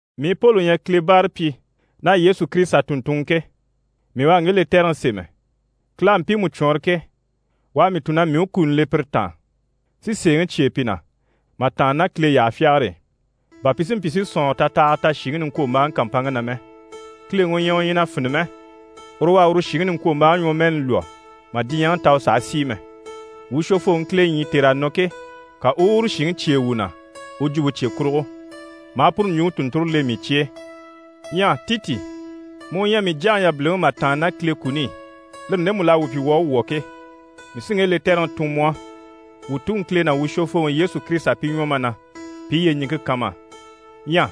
Mii Poli u ɲyɛ Kile báarapyi ná Yesu Kirisita tùnntunŋɔ ke, mii u à ŋge lɛtɛrɛŋi sémɛ. Kile à mpiimu cwɔɔnrɔ ke, u à mii tun na mii u kuni le pire taan, si sèeŋi cyêe pi na mà tàanna ná Kile yyaha fyagare e, bà pi si mpyi si sɔ̀nŋɔrɔ tatahaga ta shìŋi niŋkwombaaŋi kàmpanŋke na mɛ. Kileŋi u ɲyɛ u ɲyɛ na fini mɛ, uru u à uru shìŋi niŋkwombaaŋi ɲwɔmɛɛni lwɔ́ mà diɲyɛŋi ta u sàha sìi mɛ. Wuu Shwofooŋi Kile ɲyii tèr'à nɔ ke, ka u u uru shìŋi cyêe wuu na u jwumpe cye kurugo, maa puru ɲjwuŋi tùnnture le mii cye e. Ɲyɛ Titi, mu u ɲyɛ mii jyaŋi yabiliŋi mà tàanna ná Kile kuni i, lire ndemu l'à wuu pyi wuu à wwɔ̀ ke, mii sí ŋge lɛtɛrɛŋi tun mu á. Wuu Tuŋi Kile ná wuu Shwofooŋi Yesu Kirisita pi ɲwɔ ma na, pi i yyeɲiŋke kan ma á. Ɲyɛ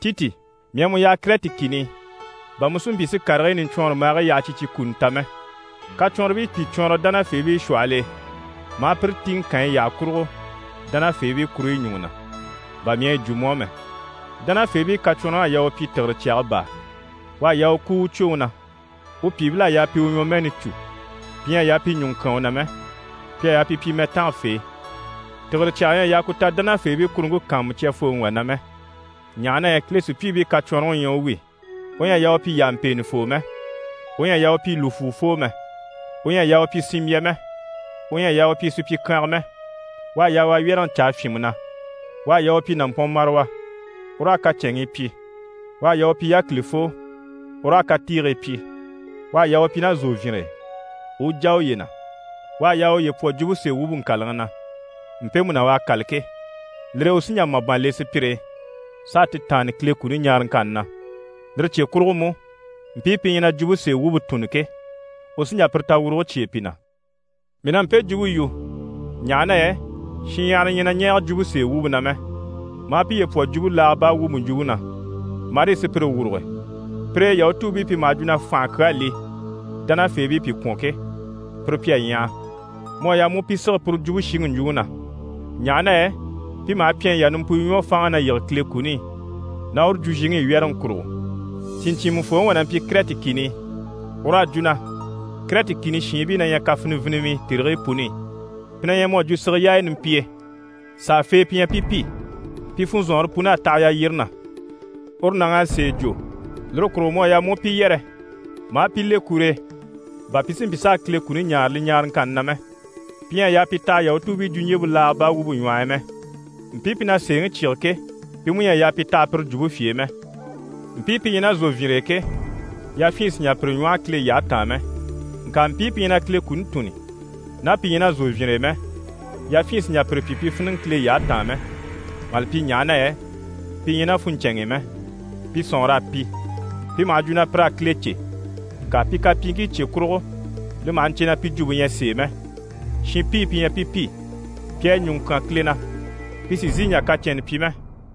Titi, mii à mu yaha Kɛrɛti kìni i, bà mu si mpyi si karigii niɲcwɔnrɔmbaagii yaha cyi cyi kuni ta mɛ. Kacwɔnribii pìi cwɔɔnrɔ dánafeebii shwɔhɔl'e ma a pire tìŋɛ kànyi yyaha kurugo dánafeebii kuruɲyi ɲùŋɔ na, bà mii à yi jwo mu á mɛ. Dánafeebii kacwɔnrɔŋ'à yaa u pyi tìgire cyaga baa, u à yaa u kúu u cwoŋi na, u pyìibil'à yaa pi u ɲwɔmɛɛni cû, pi ɲyɛ a yaa pi ɲùŋɔ kyán u na mɛ. Pi à yaa pi pyi mɛtangafee. Tìgire cyaga ɲyɛ a yaa ku ta dánafeebii kuruŋke kàanmucyafooŋi wà na mɛ, ɲaha na yɛ Kile sùpyiibii kacwɔnrɔŋi u ɲyɛ u wi, u ɲyɛ a yaa u pyi yàmpeenɛfoo mɛ, u ɲyɛ a yaa u pyi lùfwuufoo mɛ, u ɲyɛ a yaa u pyi sinmbya mɛ, u ɲyɛ a yaa u pyi supyikyanga mɛ, u à yaa u a wyɛ́rɛŋi caa fyìnmɛ na. U à yaa u pyi nàmpɔnmarawa, u raa kacɛnŋii pyi, u à yaa u pyi yákilifoo, u raa katiigii pyi, u à yaa u pyi ná zòvyinre e, u u jà uye na. U à yaa u uye pwɔ jwumpe sèe wumpe ŋkàlaŋi na, mpemu na u à kâla ke, lire e u sí n‑jà màban le sùpyire e, s'a ti taanni Kile kuni ɲaaraŋkanni na. Lire cye kurugo mú, mpii pi ɲyɛ na jwumpe sèe wumpe tùnni ke, u sí n‑jà pire tawuruge cyêe pi na. Mii na mpe jwumpe yu, ɲaha na yɛ shinɲyahara ɲyɛ na ɲɛɛge jwumpe sèe wumpe na mɛ, maa piye pwɔ jwumpe laaga baa wumpe ɲjwuŋi na, marii sùpyire wuruge, pire e Yahutuubii pi maha jwo na fànhe kyaa li dánafeebii pi kwɔ̀n ke, pire pi à ɲyaha. Mu à yaa mu u pi sige puru jwumpe shiŋi ɲjwuŋi na, ɲaha na yɛ pi maha pyɛnyi yà nimpuyo ɲwɔ fáanŋi na yige Kile kuni i ná uru jwuzhiŋi i, wyɛ́rɛŋi kurugo. Sìɲcyiimɛfooŋi wà na mpyi Kɛrɛti kìni i, ur'à jwo na: «Kɛrɛti kìni shiinbii na ɲyɛ kafinivinimii tèrigii puni i, pi na ɲyɛ mu à jwo sige yaaya nimpiye, sàafee pi ɲyɛ pi pi, pi funzɔnŋɔre pun'à taha yalyire na.» Uru nàŋ'à sèe jwo, lire kurugo mu à yaa mu u pi yɛrɛ ma a pi le kur'e, bà pi si mpyi s'a Kile kuni ɲaare li ɲaaraŋkanni na mɛ. Pi ɲyɛ a yaa pi taha Yahutuubii jwuɲjyempe laaga baa wumpe ɲwɔh'i mɛ. Mpii pi na sèeŋi cyíge ke, pi mú ɲyɛ a yaa pi taha pire jwumpe fye e mɛ. Mpii pi ɲyɛ ná zòvyinre e ke, yafyin sì n‑jà pi ɲwɔ́hɔ Kile yyahe taan mɛ, ŋka mpii pi ɲyɛ na Kile kuni tùnni, ná pi ɲyɛ ná zòvyinre e mɛ, yafyin sì n‑jà pire pyi pi fíniŋɛ Kile yyahe taan mɛ, mà li pyi ɲaha na yɛ pi ɲyɛ ná funɲcɛnŋ'i mɛ, pi sɔ̀nŋɔr'à pi. Pi maha jwo na pir'à Kile cè, ŋka pi kapyiiŋkii cye kurugo, li maha ɲcè na pi jwumpe ɲyɛ sèe mɛ, shinpii pi ɲyɛ pi pi, pi à ɲùŋɔ kyán Kile na, pi sì n‑sìi n‑jà kacɛnnɛ pyi mɛ.